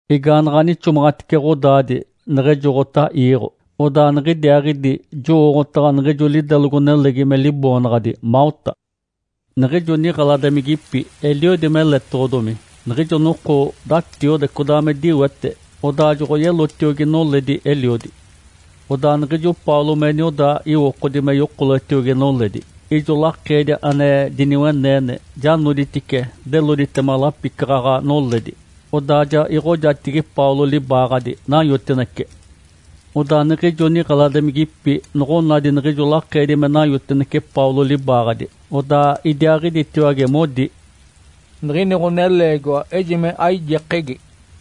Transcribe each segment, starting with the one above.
Igaanaɡ̶a nixomaɡ̶atice ɡ̶odaadi neɡ̶ejoɡ̶ota iiɡ̶o, odaa niɡ̶idiaaɡ̶idi jowooɡ̶otaɡ̶a niɡ̶ijo lidelogo-nelegi me liboonaɡ̶adi Malta. Niɡ̶ijo niɡ̶eladimigipi eliodi meletoɡ̶odomi. Niɡ̶ijo noko datiode, codaa me diwete, odaa joɡ̶oyelotiogi noledi eliodi. Odaa niɡ̶ijo Paulo me nioda iwokodi me yokoletiogi noledi, ijo lakeedi ane diniweneene ja noditice deloditema lapicaɡ̶aɡ̶a noledi, odaa ja iɡ̶ojatigi Paulo libaaɡ̶adi, nanyotinece. Odaa niɡ̶ijo niɡ̶eladimigipi noɡ̶onadi niɡ̶ijo lakeedi me nanyotinece Paulo libaaɡ̶adi, odaa idiaaɡ̶iditiwage modi, “Niɡ̶ini ɡ̶oneleegiwa ejime aijekegi!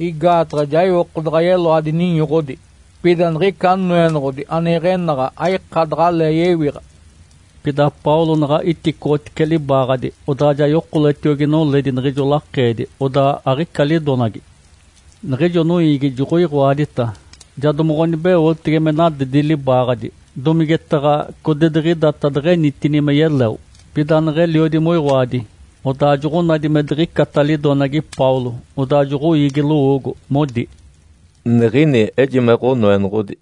Igaataɡ̶a ja iwoko daɡ̶a yeloadi ninyoɡ̶odi, pida niɡ̶ica noenoɡ̶odi ane iɡ̶enaɡ̶a aika daɡ̶alee yewiɡ̶a.” Pida Paulo naɡ̶a iticoɡ̶otice libaaɡ̶adi, odaa ja yokoletiogi noledi niɡ̶ijo lakeedi, odaa aɡ̶ica lidonagi. Niɡ̶ijo noiigi joɡ̶oiɡ̶oadita, ja domoɡ̶onibeotege me nadedi libaaɡ̶adi, domigetaɡ̶a codidiɡ̶idata deɡ̶enitini me yeleo. Pida neɡ̶eliodi moiɡ̶oadi, odaa joɡ̶onadi me diɡ̶icata lidonagi Paulo. Odaa joɡ̶oiigi lowoogo, modi, “Niɡ̶ini ejime ɡ̶onoenoɡ̶odi!”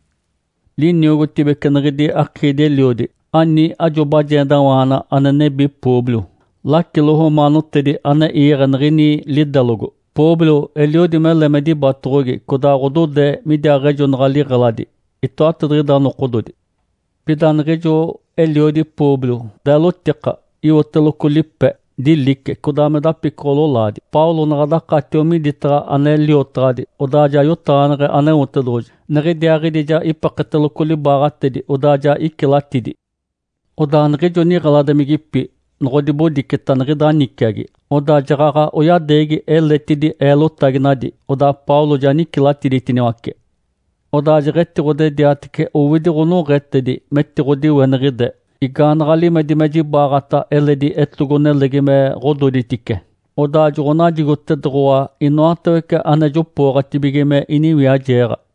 Liniogotibece niɡ̶idi akiidi-eliodi ani ajo bajendawaana ane nebi Públio, lacilo romaanotedi ane iiɡ̶e niɡ̶ini lidelogo. Públio eliodi mele me dibatoɡ̶ogi, codaa ɡ̶odode midiaaɡ̶ejonaɡ̶a liɡ̶eladi itoatadiɡ̶ida nokododi. Pida niɡ̶ijo eliodi Públio deelotika, iwoteloco lipe. Dilice, codaa me dapicoɡ̶o-lolaadi. Paulo naɡ̶a dakatio miditaɡ̶a ane liotaɡ̶adi, odaa ja yotaɡ̶aneɡ̶e Aneotedoɡ̶oji. Niɡ̶idiaaɡ̶idi ja ipeketeloco libaaɡ̶atedi, odaa ja icilatidi. Odaa niɡ̶ijo niɡ̶eladimigipi noɡ̶odibodiceta niɡ̶ida niciagi, odaa jaɡ̶aɡ̶a oyadeegi eletidi eelotaginadi, odaa Paulo ja nicilatiditiniwace. Odaa jeɡ̶etiɡ̶odediatece owidi ɡ̶onoɡ̶etedi metiɡ̶odiweniɡ̶ide, igaanaɡ̶a limedi me jibaɡ̶ata eledi etogo-nelegi me ɡ̶ododitice, odaa joɡ̶onajigotedoɡ̶owa inoatawece ane jopooɡ̶atibige me iniwiajeeɡ̶a.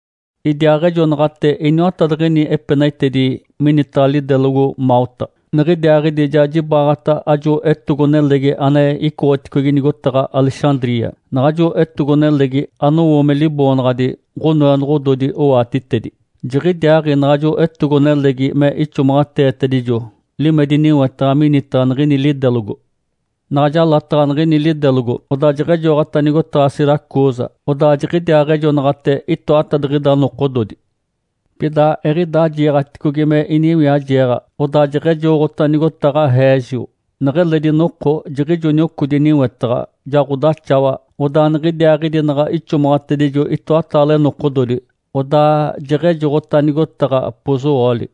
Idiaaɡ̶ejonaɡ̶ate iniwatadiɡ̶ini epenaitedi minitaɡ̶a lidelogo Malta, niɡ̶idiaaɡ̶idi ja jibaɡ̶ata ajo etogo-nelegi ane icoɡ̶oticogi nigotaɡ̶a Alexandria. Naɡ̶ajo etogo-nelegi anowo me liboonaɡ̶adi, “Ǥonoenoɡ̶ododi owatitedi”. Jiɡ̶idiaaɡ̶i naɡ̶ajo etogo-nelegi me ixomaɡ̶ateetedijo limedi niwetaɡ̶a minitaɡ̶a niɡ̶ini lidelogo. Naɡ̶a jalataɡ̶a niɡ̶ini lidelogo, odaa jeɡ̶ejoɡ̶ota nigotaɡ̶a Siracusa, odaa jiɡ̶idiaaɡ̶ejonaɡ̶ate itoatadiɡ̶ida nokododi. Pida eɡ̶idaa jiiɡ̶aticogi me iniwiajeeɡ̶a, odaa jeɡ̶ejoɡ̶ota nigotaɡ̶a Régio. Neɡ̶eledi noko jiɡ̶ijo niocodi niwetaɡ̶a, ja ɡ̶odaxawa, odaa niɡ̶idiaaɡ̶idi naɡ̶a ixomaɡ̶atedijo itoataale nokododi, odaa jeɡ̶ejoɡ̶ota nigotaɡ̶a Pozuoli.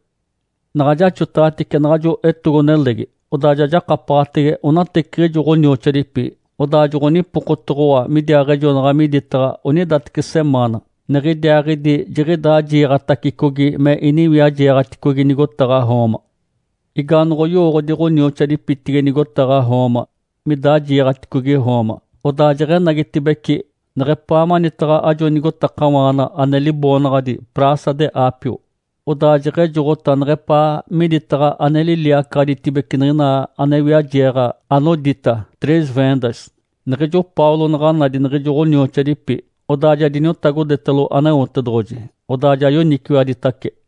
Naɡ̶a jaxotaɡ̶atice naɡ̶ajo etogo-nelegi, odaa ja jakapaɡ̶atege onateciɡ̶ijo ɡ̶onioxoadipi, odaa joɡ̶onipokotoɡ̶owa midiaaɡ̶ejonaɡ̶a miditaɡ̶a onidateci semaana. Niɡ̶idiaaɡ̶idi jiɡ̶idaa jiiɡ̶atacicogi me iniwiajeeɡ̶aticogi nigotaɡ̶a Roma. Igaanoɡ̶oyowooɡ̶odi ɡ̶onioxoadipitigi nigotaɡ̶a Roma midaa jiiɡ̶aticogi Roma, odaa jeɡ̶enagitibeci neɡ̶epaa manitaɡ̶a ajo nigotakawaana ane liboonaɡ̶adi Praça de Ápio, odaa jeɡ̶ejoɡ̶ota neɡ̶epaa miditaɡ̶a ane liliacaɡ̶aditibece niɡ̶ina ane wiajeeɡ̶a anodita Três Vendas. Niɡ̶ijo Paulo naɡ̶a nadi niɡ̶ijo ɡ̶onioxoadipi, odaa ja diniotagodetalo Aneotedoɡ̶oji, odaa ja yoniciwaditace.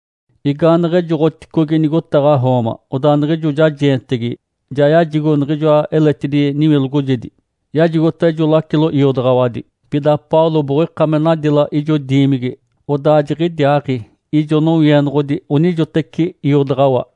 Igaaneɡ̶ejoɡ̶oticogi nigotaɡ̶a Roma, odaa niɡ̶ijo jajeentegi ja yajigo niɡ̶ijoa eletidi niwilogojedi, yajigota ijo lacilo iodaɡ̶awadi. Pida Paulo boɡ̶oika me nadila ijo diimigi, odaa jiɡ̶idiaaɡ̶i ijo nowienoɡ̶odi onijoteci iodaɡ̶awa.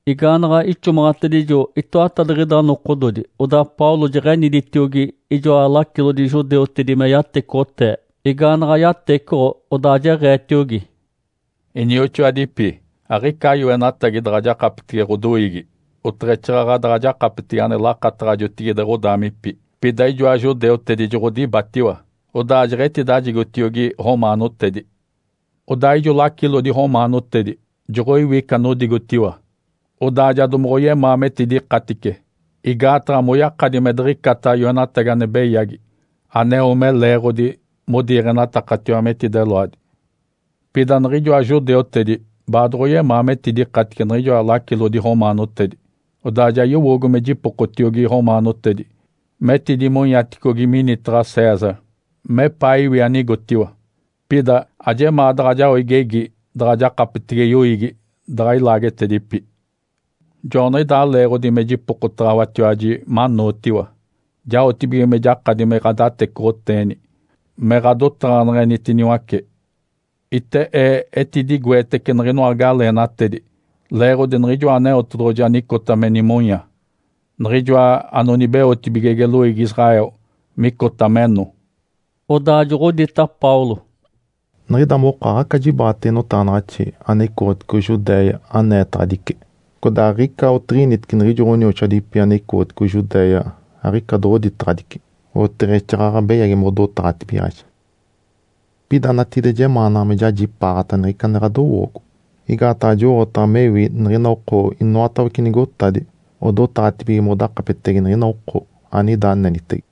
Igaanaɡ̶a ixomaɡ̶atedijo itoatadiɡ̶ida nokododi, odaa Paulo jeɡ̶eniditiogi ijoa lacilodi judeutedi me yatecoɡ̶otee. Igaanaɡ̶a yatecoɡ̶o, odaa jeɡ̶eetiogi, “Inioxoadipi, aɡ̶ica yoenatagi daɡ̶a jakapetege ɡ̶odoiigi, oteɡ̶exaaɡ̶aɡ̶a daɡ̶a jakapetege ane lakataɡ̶a jotigide ɡ̶odaamipi. Pida ijoa judeutedi joɡ̶odibatiwa, odaa jeɡ̶etidajigotiogi romaanotedi. Odaa ijo lacilodi romaanotedi joɡ̶oiwi ica anodigotiwa, odaa ja domoɡ̶oyemaa metidikatice, igaataɡ̶a moyakadi me diɡ̶icata yoenatagi ane beyagi aneo me leeɡ̶odi modiiɡ̶enatakatiwa metideloadi. Pida niɡ̶ijoa judeutedi baadoɡ̶oyemaa metidikatice niɡ̶ijoa lacilodi romaanotedi. Odaa ja yowoogo me jipokotiogi romaanotedi metidimonyaticogi minitaɡ̶a César, mepaa iwi anigotiwa. Pida ajemaa daɡ̶a jao igegi daɡ̶a jakapetege yoiigi daɡ̶a ilaagetedipi. Joaniɡ̶idaa leeɡ̶odi me jipokotaɡ̶awatiwaji manootiwa, jaotibige me jakadi me ɡ̶adatecoɡ̶oteeni me ɡ̶adotaɡ̶aneɡ̶enitiniwace. Ite ee etidigoetece niɡ̶inoa galeenatedi leeɡ̶odi Niɡ̶ijoa Aneotedoɡ̶oji anicota me nimonya, Niɡ̶ijoa anonibeotibigege loiigi Israel micota meno.” Odaa joɡ̶odita Paulo, “Niɡ̶ida moko aɡ̶aca jibaɡ̶atege notaɡ̶anaɡ̶axi ane icoɡ̶otigi Judéia aneetaɡ̶adice. Codaa aɡ̶ica otiɡ̶initece niɡ̶ijo ɡ̶onioxoadipi ane icoɡ̶oticogi Judéia aɡ̶ica doɡ̶oditaɡ̶adici, oteɡ̶exaaɡ̶aɡ̶a beyagi modotaɡ̶atibigaɡ̶aji. Pida natigide jemaanaɡ̶a me jajipaaɡ̶ata niɡ̶ica ane ɡ̶adowoogo, igaataɡ̶a jowooɡ̶otaɡ̶a mewi niɡ̶ina oko inoatawece nigotadi odotaɡ̶atibige modakapetege niɡ̶ina oko anida anenitege.”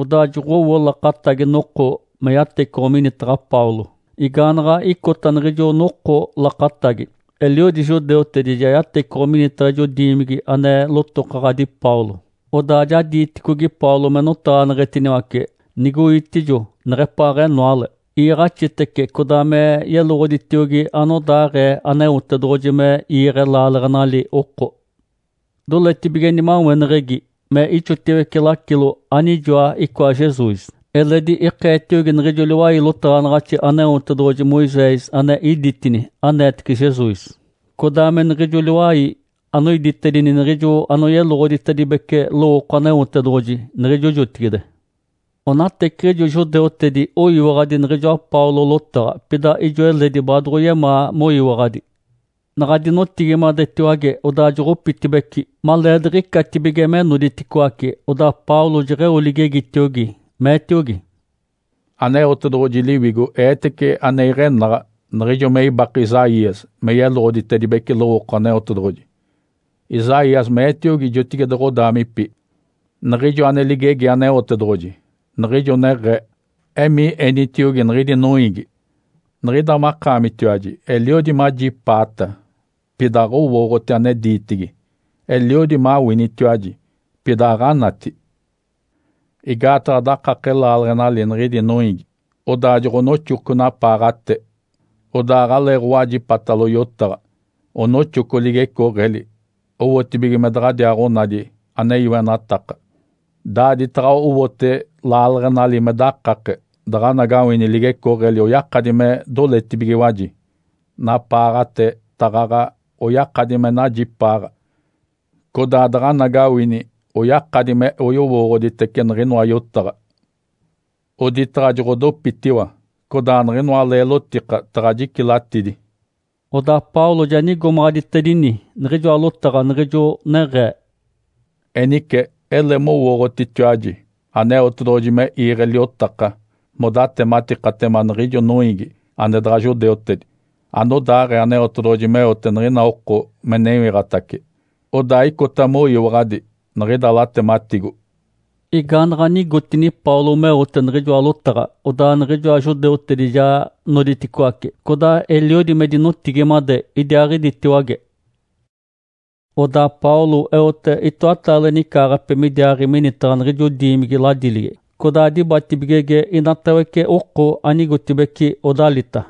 Odaa joɡ̶owo lakatagi noko me yatecoɡ̶o minitaɡ̶a Paulo. Igaanaɡ̶a icota niɡ̶ijo noko lakatagi, eliodi judeutedi ja yatecoɡ̶o minitaɡ̶a ijo diimigi ane lotokaɡ̶adi Paulo. Odaa ja diiticogi Paulo me notaɡ̶aneɡ̶etiniwace, nigoitijo neɡ̶epaaɡ̶enoale. Iiɡ̶axitice codaa me yeloɡ̶oditiogi anodaaɡ̶ee Aneotedoɡ̶oji me iiɡ̶e laaleɡ̶enali oko. Doletibige nimaweneɡ̶egi me ixotiwece lacilo anijoa icoa Jesus. Eledi ikeetiogi niɡ̶ijo liwai lotaɡ̶anaɡ̶axi Aneotedoɡ̶oji Moisés ane iditini aneetece Jesus, codaa me niɡ̶ijo liwai anoiditedini niɡ̶ijo anoyeloɡ̶oditedibece lowooko Aneotedoɡ̶oji niɡ̶ijo jotigide. Onateciɡ̶ijo judeutedi oyiwaɡ̶adi niɡ̶ijoa Paulo lotaɡ̶a, pida ijo eledi baadoɡ̶oyemaa moyiwaɡ̶adi. Naɡ̶a dinotigimadetiwage, odaa joɡ̶opitibeci. Maleediɡ̶icatibige me noditicoaci, odaa Paulo jeɡ̶eo ligegitiogi, meetiogi, “Aneotedoɡ̶oji Liwigo eetece ane iɡ̶enaɡ̶a niɡ̶ijo me ibake Isaías me yeloɡ̶oditedibece lowooko Aneotedoɡ̶oji. Isaías meetiogi jotigide ɡ̶adaamipi niɡ̶ijo ane ligegi Aneotedoɡ̶oji, niɡ̶ijo neɡ̶ee, ‘Emii enitiogi niɡ̶idi noiigi, “Niɡ̶ida makaamitiwaji eliodi majipaata, pida aɡ̶owooɡ̶oti ane diitigi! Eliodi mawinitiwaji, pida aɡ̶anati!” Igaataɡ̶a dakake laaleɡ̶enali niɡ̶idi noiigi. Odaa joɡ̶onoxoco napaaɡ̶ate, odaa aɡ̶aleeɡ̶owajipatalo yotaɡ̶a, onoxoco ligecooɡ̶eli owotibige me daɡ̶adiaaɡ̶onadi ane yoenataka. Daaditaɡ̶a owote laaleɡ̶enali me dakake, daɡ̶anagawini ligecooɡ̶eli oyakadi me doletibigiwaji, napaaɡ̶ate taɡ̶aɡ̶a oyakadi me najipaaɡ̶a, codaa daɡ̶anagawini oyakadi me oyowooɡ̶oditece niɡ̶inoa yotaɡ̶a, oditaɡ̶a joɡ̶odopitiwa, codaa niɡ̶inoa leelotika taɡ̶a jicilatidi.’” Odaa Paulo ja nigomaɡ̶aditedini niɡ̶ijoa lotaɡ̶a niɡ̶ijo neɡ̶ee, “Enice ele mowooɡ̶otitiwaji Aneotedoɡ̶oji me iiɡ̶e liotaka modatematikatema niɡ̶ijo noiigi ane daɡ̶a judeutedi anodaaɡ̶ee Aneotedoɡ̶oji meote niɡ̶ina oko me newiɡ̶atace. Odaa icota moyiwaɡ̶adi niɡ̶ida latematigo.” Igaanaɡ̶a nigotini Paulo meote niɡ̶ijoa lotaɡ̶a, odaa niɡ̶ijoa judeutedi ja noditicoaci, codaa eliodi me dinotigimade idiaaɡ̶iditiwage. Odaa Paulo eote itoataale nicaaɡ̶ape midiaaɡ̶i minitaɡ̶a niɡ̶ijo diimigi ladiligi, codaa dibatibigege inatawece oko anigotibeci odalita.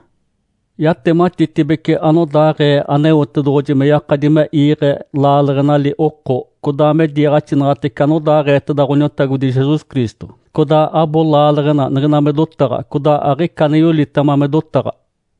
Yatematitibece anodaaɡ̶ee Aneotedoɡ̶oji me yakadi me iiɡ̶e laaleɡ̶enali oko, codaa me diiɡ̶axinaɡ̶atece anodaaɡ̶eeteda Ǥoniotagodi Jesus Cristo. Codaa abo laaleɡ̶ena niɡ̶ina me dotaɡ̶a, codaa aɡ̶ica ane yolitema me dotaɡ̶a.